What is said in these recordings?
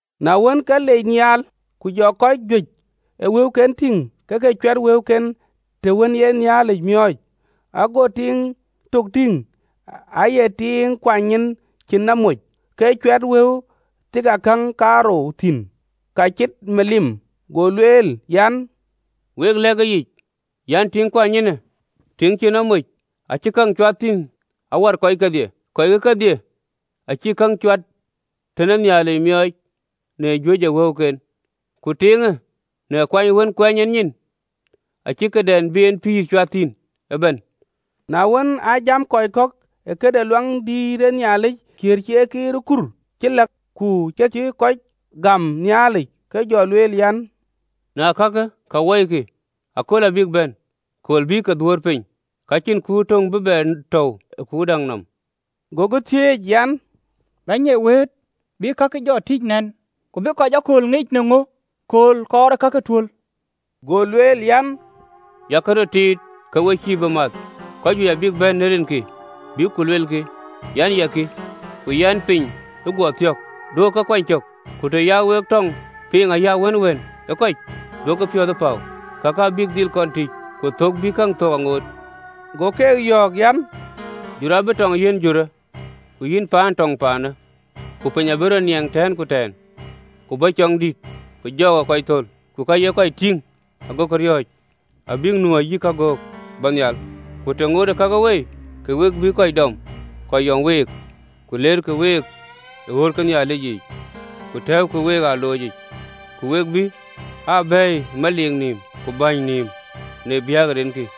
Na wën, ke liec nhial, ku jɔ kɔc juëc ë wëuken tïŋ ke ke cuɛt kaken të wën ee ye Nhialic miɔɔc. Ago tiiŋ tök tïŋ aya tiiŋ kuany nyin cïn nɔm moc, ke cuɛt wëu thiiakäŋ kaarou thïn, ka cït miliim. Go lueel an, “Wek lɛ̈k ëyic an, “Tiiŋ kuany nyinë tiiŋ cïn nɔm moc acï käŋ cuat thïn awär kɔc kedhie. Kɔckë kedhie acïk käŋ cuat tën ee Nhialic miɔɔc në juëc ë wëuken, ku tiiŋë në kuany wën kuɛɛny en nyin acï këdɛn bï en pïïr cuat thïn ëbɛ̈n.” Na wën, aa jam kɔc kɔ̈k ë këde Luaŋdït, kiëër cï e kiir ë kur cï läk ku ka cï kɔc gäm Nhialic, ke jɔ lueel an: “Në ee ka wɔikï yë, akööl abïk bɛ̈n, kööl bï ke dhuöör piny, ka cïn kuur töŋ bï bɛ tɔ̈u ë kuur däŋ nɔm.” Gokï thiëëc an, “Bɛ̈ny ee wëët, bï kake jɔ tïc nɛn? Ku bï kɔc akööl ŋic në ŋö kööl kɔɔr ee kakë tuöl? Go lueel an, “Yak röt tiit, ke we cïï bï math: kɔc juëc abïk bɛ̈n në rinkï, bïk ku lueelkï an, ‘Ya kï!’ Ku an, ‘Piny ë guɔ thiɔ̈k!’ Duökï ke kuany cök. Ku të ya wek tɔɔŋ piŋ ayï awënwën ë kɔc, duökï piɔ̈th ee päu: kakë abïk dhil kɔn tïc, ku thök bï käŋ thök aŋoot. Go keek yɔ̈ɔ̈k an, “Jurë abï tɔŋ yiɛ̈n jurë, ku yïn ciɛɛŋë tɔŋ ciɛɛŋë. Ku piny abï rɔt niɛŋ tɛ̈ɛ̈n ku tɛ̈ɛ̈n, ku bɔ̈ cɔŋdït ku jɔɔk ee kɔc thöl, ku ka ye kɔc tïŋ agokï riɔ̈ɔ̈c abïk nu ayï kagöök bɔ̈ nhial. Ku të ŋootë kakë wei, ke we bïï kɔc dɔm, ku yɔŋkï week, ku leerkï week ë ɣööt ke Nhialic yiic, ku tɛ̈ɛ̈ukï week ë aloc yiic, ku we bï aa bɛ̈ɛ̈i ë meliik nïïm ku bäny nïïm në biäk de rinkï.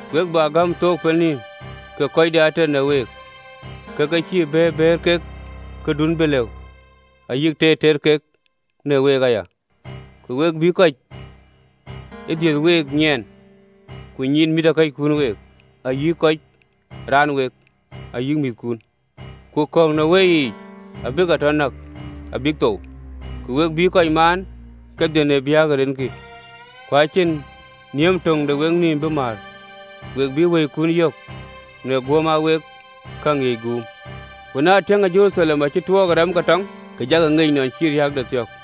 we bä gäm thook pɛlënɔm, ke kɔc de ater në week ke ke cïï bëër bëër kek këdun bï lëu, ayï teer teer kek në week aya. Ku we bï kɔc ë dhiëth week nyiɛɛn, ku nyiin mïthëkɔckun week, ayï kɔc raan ë week, ayï määthkun, ku kɔ̈k në weyiic abï ke tɔ näk abïk thou. Ku we bïï kɔc maan kedhie në biäk de rinkï. Ku acïn nhiëm töŋ de weknïïm bï määr. We bï wëikun yök në guöm aa wek käŋ ŋiëc guum. “Ku na tiëŋkï Jeruthalem acï tuɔɔk ë rɛm ke tɔŋ, ke jakï ŋic nɔn cï riääkde thiɔ̈k.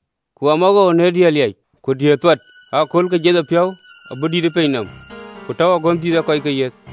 Ku amawoou në diëër liac ku diëër thuat ë aköölkë! Jiɛthëpiɔ̈u abï dït ë piny nɔm, ku agönh ë Nhialic abï lööny ee kɔckë yiëth.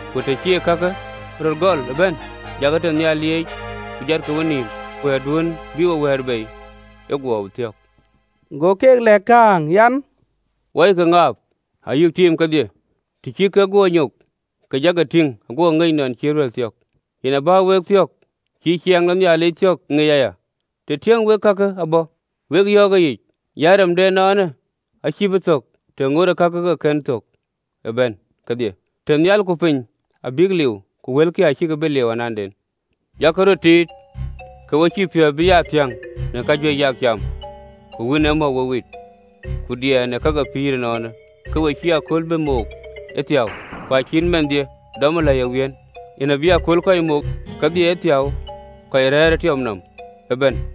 Ku të cï kakë röt gɔl ë bɛ̈n, jakï nhial lieec, ku jatkï wenïïm, wɛ̈ɛ̈rduön bï we wɛ̈ɛ̈r bei ee guɔ thiɔ̈k.” Go keek lɛ̈k kääŋ an: “Wɔikï ŋaap, ayï tiim kedhie. Të cï kek guɔ nyok, ke jakï tïŋ aguɔkï ŋic guöp nɔn cï deŋ amäi thiɔ̈k. Yen a bä wek thiɔ̈k cï ciɛɛŋ de Nhialic thiɔ̈k ŋic aya, të tiëŋ wek kakë abɔ̈. Wek yɔ̈ɔ̈k ëyic an, “Rem de ënɔɔnë acïï bï thök, të ŋootë kakë ke ke kën thök ë bɛ̈n kedhie. Tënhial ku piny abïk liu, ku wëlkï acïkï bï liu ananden. “Yak röt tiit, ke we cïï piɔ̈ɔ̈th bï aa thiäŋ në kajuëc yak cam, ku wïn ee mɔu we wit, ku diɛɛr në ka ke pïïr ënɔɔnë, ke we cïï ëköölë bï mook ëthiäu. Ku acït man dhie dɔmë lɛ̈i ë wiën yen abï ëköölë kɔc mook kedhie ëthiäu kɔc rɛ̈ɛ̈r ë tiɔp nɔm ëbɛ̈n.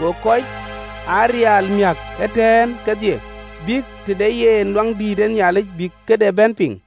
Go kɔc aa riëël miäk ëtɛ̈ɛ̈n kedhie bïk tëde yen ë Luaŋdïtic, bïk këde bɛ̈n piŋ.